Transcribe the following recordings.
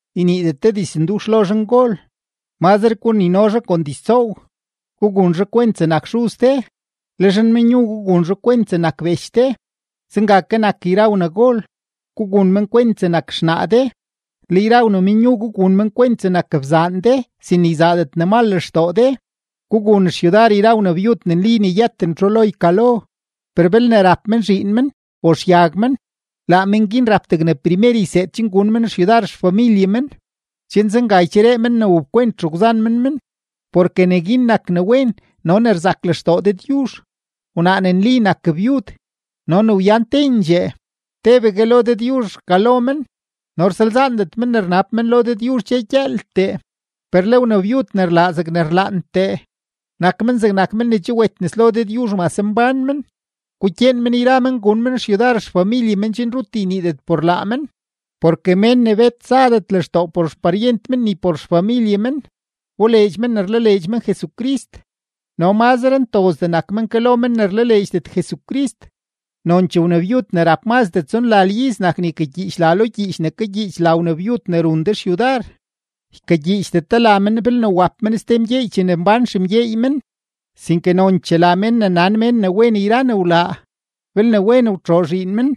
Yniidet de dizndux lo zhangol; mazre gunino zhaa kon diztsoow; gugun zhaa kwent zegnak xuz de. Le zhanmenyu, gugun zhaa kwent zegnak bech de. Zenga ke nak yra wnagol, gugun men kwent zegnak xnaa de. Le yra wnamenyu, gugun men kwent zegnak bzaan de sin ne yzaadet ne mal lextoo de. Gugun xyudar yra wnabyud ne nli yëten txu lo ykalo. Per belne rap men zhiin men o xyag men, laa men guin rap degne primer yseed gun men xyudar xfamilye men, chen zenga ycheree men ne wapkwent xegwzan men men, porke neguin nak ne wen no ne rzak lextoo Dëdyuzh. Wnaa ne nli nak byud no ne wyan tendxee, tebegue lo Dëdyuzh rkalo men no rsalzaandet men ne rnab men lo Dëdyuzh dxe gyëëltee. Per le wnabyud ne rlaa zegne rlaantee, nak men zegnak men ne che wet nes lo Dëdyuzh mase mbán men. Gukyeen men yra men gun men xyudar xfamilye men chen rut yniidet por laa men. Porke mén ne bet zadet lextoo por xparyent men ni por xfamilye men, wboleedx men ne rlaleedx men Jesucrist no mazre ntozdee nak men ke lo men ne rlaleedxdet Jesucrist. Nonchee wnabyud ne rap mazdee tsonlal iz nak ne ykagyiich la lo gyiich ne kagyiich la wnabyud ne run de xyudar. Ykagyiichdet de la men belne wap men ste mgyeey chene mbán xemgyeey men, sinke nonchee la men ne nan mén ne wen yra ne wlaa: belne wen wtxoo zhiin men,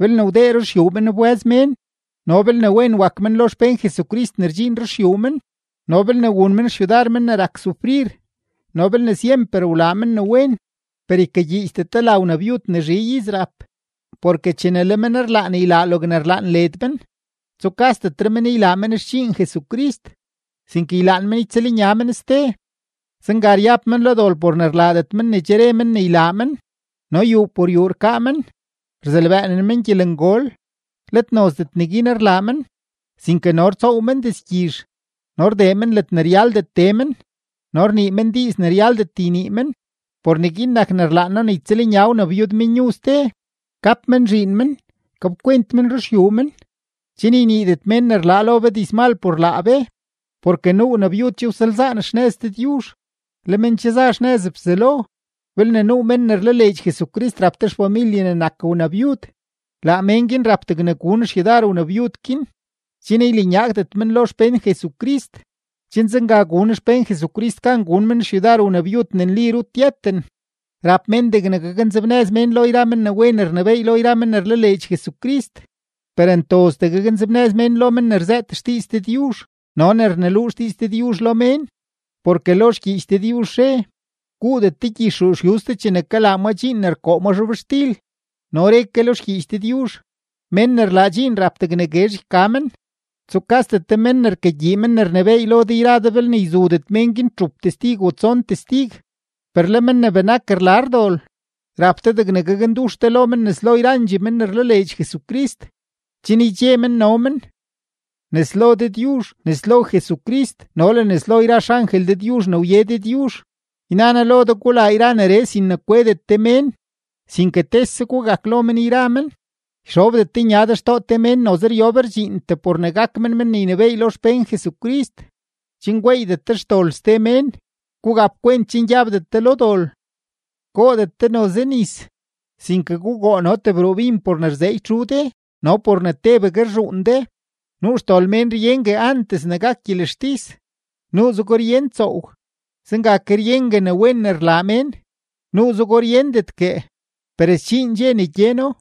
belne wdee ruxyuu men wbë́z mén, no belne wen wak men lo xpén Jesucrist ne rdxiin ruxyuu men, no belne wun men xyudar men ne rak sufrir, no belne syemper wlaa men ne wen. Per ykagyiichdet de la wnabyud ne zhi iz rap, porke chene le men ylaan ylaa logne rlaan led men, tsukasdetre men ylaa men xdxiin Jesucrist, sinke ylaan men ytsëlnya men ste. Zenga ryab men lo dol por ne rlaadet men ne che re men ne ylaa men. No yuu por yuu rkaa men, rzelbëënen men gyelengol; let nozdet neguin rlaa men, sinke no rtsoow men dizgyizh, no rdee men ledne ryaldet tee men, no rnii men diiz ne ryaldet ynii men. Por neguin nak ne rlaan noo ne ytsëlnya wnabyudmenyu ste, gap men zhiin men, gapkwent men ruxyuu men, chen yniidet mén ne rlaa lo be dizmal por laa be. Porke nuu wnabyud che wsalzaan xnëz Dëdyuzh, le men che za xnëz Bzelo. Belne nuu mén ne rlaleedx Jesucrist rap te xfamilye ne nak wnabyud, laa mén guin rap degne gun xyudar wnabyud guin, chen ylanyaagdet men lo xpén Jesucrist; chen zenga gun xpén Jesucrist gan gun men xyudar wnabyud ne nli rut yëten. Rap mén degne gaknzebnëz mén lo men ne wen rnebééy lo yra men ne rlaleedx Jesucrist, per ntozdee gaknzebnëz mén lo men ne rzëët xdiiz Dëdyuzh no ne rneluu xdiiz Dëdyuzh lo mén. Porke lo xgyiich Dëdyuzh re: “Guudet de gyix ruu yuz chene kalaa ma dxiin ne rkoo ma zhobxtil.” No re ke lo xgyiich Dëdyuzh: “Mén ne rlaa dxiin rap degne guezh yka men.” Tsukasdet de mén ne rkagyii men ne rnebééy lo de yra de belne yzudet mén guin txup testig o tson testig. Per le men ne benak rlar dol, rap de degne gakndux de lo men nes lo yrandxee men ne rlaleedx Jesucrist, chen ydxe men no men. Nes lo Dëdyuzh, nes lo Jesucrist no le nes lo yra xangel Dëdyuzh ne wye Dëdyuzh, yna noo lo de gulaa yra neree sin ne kwedet de mén, sinke tese gugak lo men yra men. Yxobdet de nya de xtoo te mén noze ryob rdxiintee por ne gak men men ne ynebééy lo xpén Jesucrist, chen gweeydet de xdol ste mén. Gugap kwent chen gyabdet de lo dol. Goodet de noze nis, sinke gugoo no tebruu bin por ne rzeeky txu de no por ne tebegue rzhuun de. Nuu xdol mén ryengue antes ne gak gyelextis, nuuzego ryen tsoow. Zenga ke ryengue ne wen ne rlaa mén, nuuzego ryendetguee, per sdxiin dxe ne gyeno.